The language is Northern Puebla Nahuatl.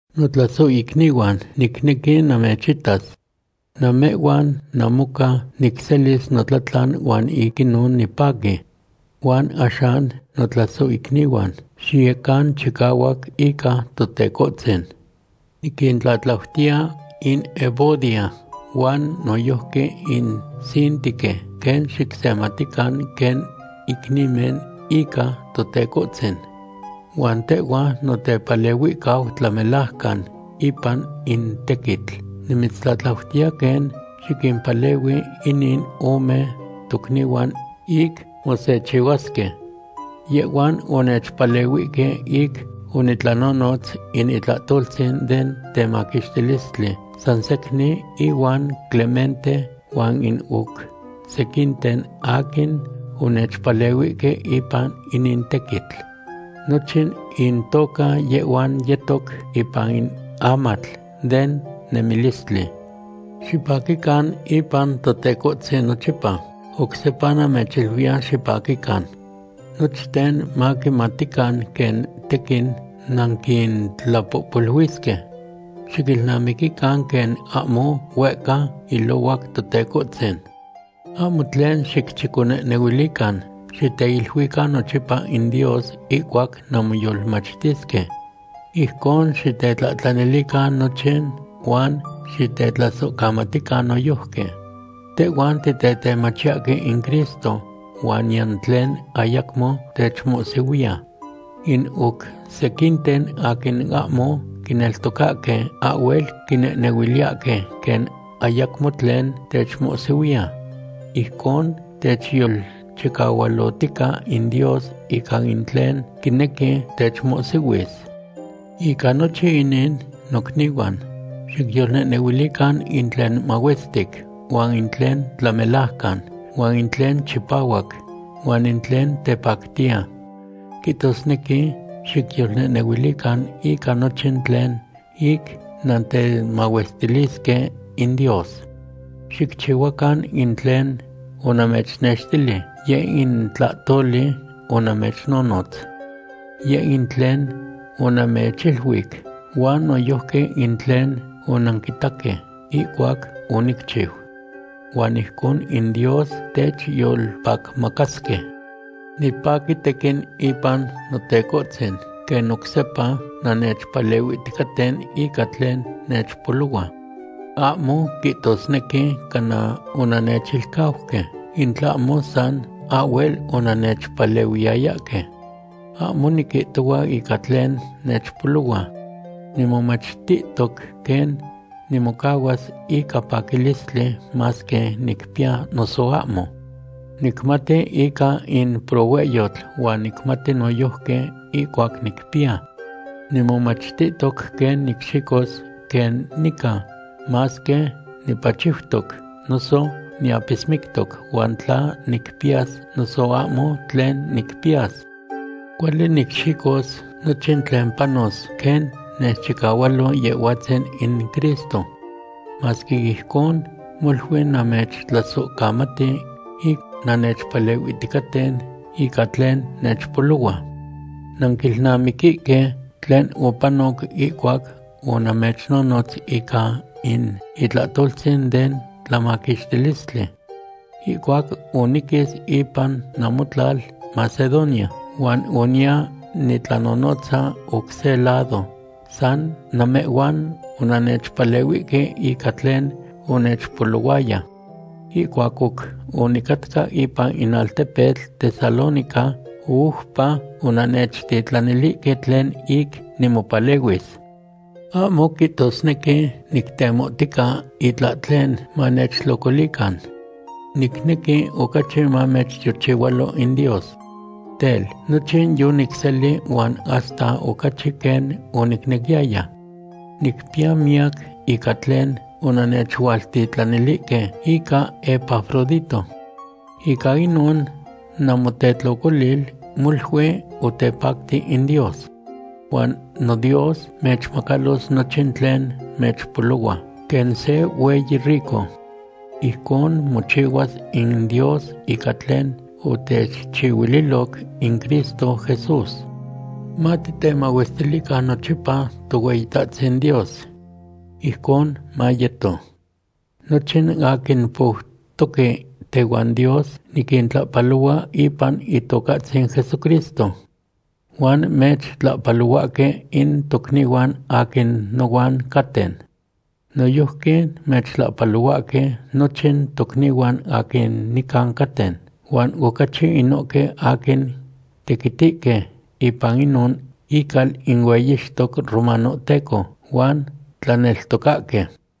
Notlasohicnihuan, nicnequi namechitas. Namehhuan namoca nicselis notlatlan huan ic inon nipaqui. Huan axan notlasohicnihuan, xiyecan chicahuac ica Totecohtzin. Niquintlatlautiya in Evodia huan noyojqui in Síntique quen xicsematican quen icnimen ica Totecohtzin. Huan tehhua, notepalehuihcau tlamelajcan ipan in tequitl, nimitztlatlautiya quen xiquimpalehui inin ome tocnihuan ic mosechihuasque. Yehhuan onechpalehuihque ic onitlanonotz in itlahtoltzin den temaquixtilistli san secnin ihuan Clemente huan in oc sequinten aquin onechpalehuihque ipan inin tequitl. Nochin intoca yehhuan yetoc ipan in amatl den nemilistli. Xipaquican ipan Totecohtzin nochipa. Oc sepa namechiluiya, xipaquican. Nochten maquimatican quen tequin nanquintlapohpoluisque. Xiquilnamiquican quen ahmo huehca ilohuac Totecohtzin. Ahmo tlen xicchiconehnehuilican. Xiteiluican nochipa in Dios ihcuac nanmoyolmachtisque. Ijcon xitetlahtlanilican nochin huan xitetlasohcamatican noyojqui. Tehhuan titetemachiyahque in Cristo huan niyan tlen ayacmo techmohsihuiya. In oc sequinten aquin ahmo quineltocahque ahhuel quinehnehuiliyahque quen ayacmo tlen techmohsihuiya. Ijcon techyolchicahualotica in Dios ica in tlen quinequi techmohsihuis. Ica nochin inin, nocnihuan, xicyolnehnehuilican in tlen mahuestic, huan in tlen tlamelajcan, huan in tlen chipahuac, huan in tlen tepactiya. Quihtosnequi xicyolnehnehuilican ica nochin tlen ic nantemahuestilisque in Dios. Xicchihuacan in tlen onamechnextili, yeh in tlahtoli onamechnonotz. Yeh in tlen onamechiluic huan noyojqui in tlen onanquitaque ihcuac onicchiu. Huan ijcon in Dios techyolpacmacasque. Nipaqui tequin ipan Notecohtzin quen oc sepa nannechpalehuihticaten ica tlen nechpolohua. Ahmo quihtosnequi cana onannechilcauque, in tlahmo san ahhuel onannechpalehuiyayahque. Ahmo niquihtohua ica tlen nechpolohua. Nimomachtihtoc quen nimocahuas ica paquilistli masque nicpiya noso ahmo. Nicmati ica in prohuehyotl huan nicmati noyojqui ihcuac nicpiya. Nimomachtihtoc quen nicxicos quen nica, masque nipachiutoc noso niapismictoc, huan tla nicpiyas noso ahmo tlen nicpiyas. Cuali nicxicos nochin tlen panos quen nechchicahualo Yehhuatzin in Cristo. Masque ijcon, molui namechtlasohcamati ic nannechpalehuihticaten ica tlen nechpolohua. Nanquilnamiquihque tlen opanoc ihcuac onamechnonotz ica in itlahtoltzin den tlamaquixtilistli. Ihcuac oniquis ipan namotlal Macedonia, huan oniya nitlanonotza oc se lado, san namehhuan onannechpalehuihque ica tlen onechpolohuaya. Ihcuac oc onicatca ipan in altepetl Tesalónica, oupa onannechtitlanilihque tlen ic nimopalehuis. Ahmo quihtosnequi nictemohtica itlahtlen manechtlocolican. Nicnequi ocachi mamechtiochihualo in Dios. Tel, nochin yonicseli, huan hasta ocachi quen onicnequiyaya. Nicpiya miyac ica tlen onannechualtitlanilihque ica Epafrodito. Ica inon namotetlocolil molui otepacti in Dios. Huan noDios mechmacalos nochin tlen mechpolohua, quen se hueyi rico. Ijcon mochihuas in Dios ica tlen otechchihuililoc in Cristo Jesús. Matitemahuestilican nochipa Tohueyitahtzin Dios. Ijcon mayeto. Nochin aquin poutoque tehuan Dios niquintlahpalohua ipan Itocahtzin Jesucristo. Huan mechtlahpalohuahque in tocnihuan aquin nohuan caten. Noyojqui mechtlahpalohuahque nochin tocnihuan aquin nican caten, huan ocachi inohque aquin tequitihque ipan inon ical in hueyixtoc romanohteco huan tlaneltocahque.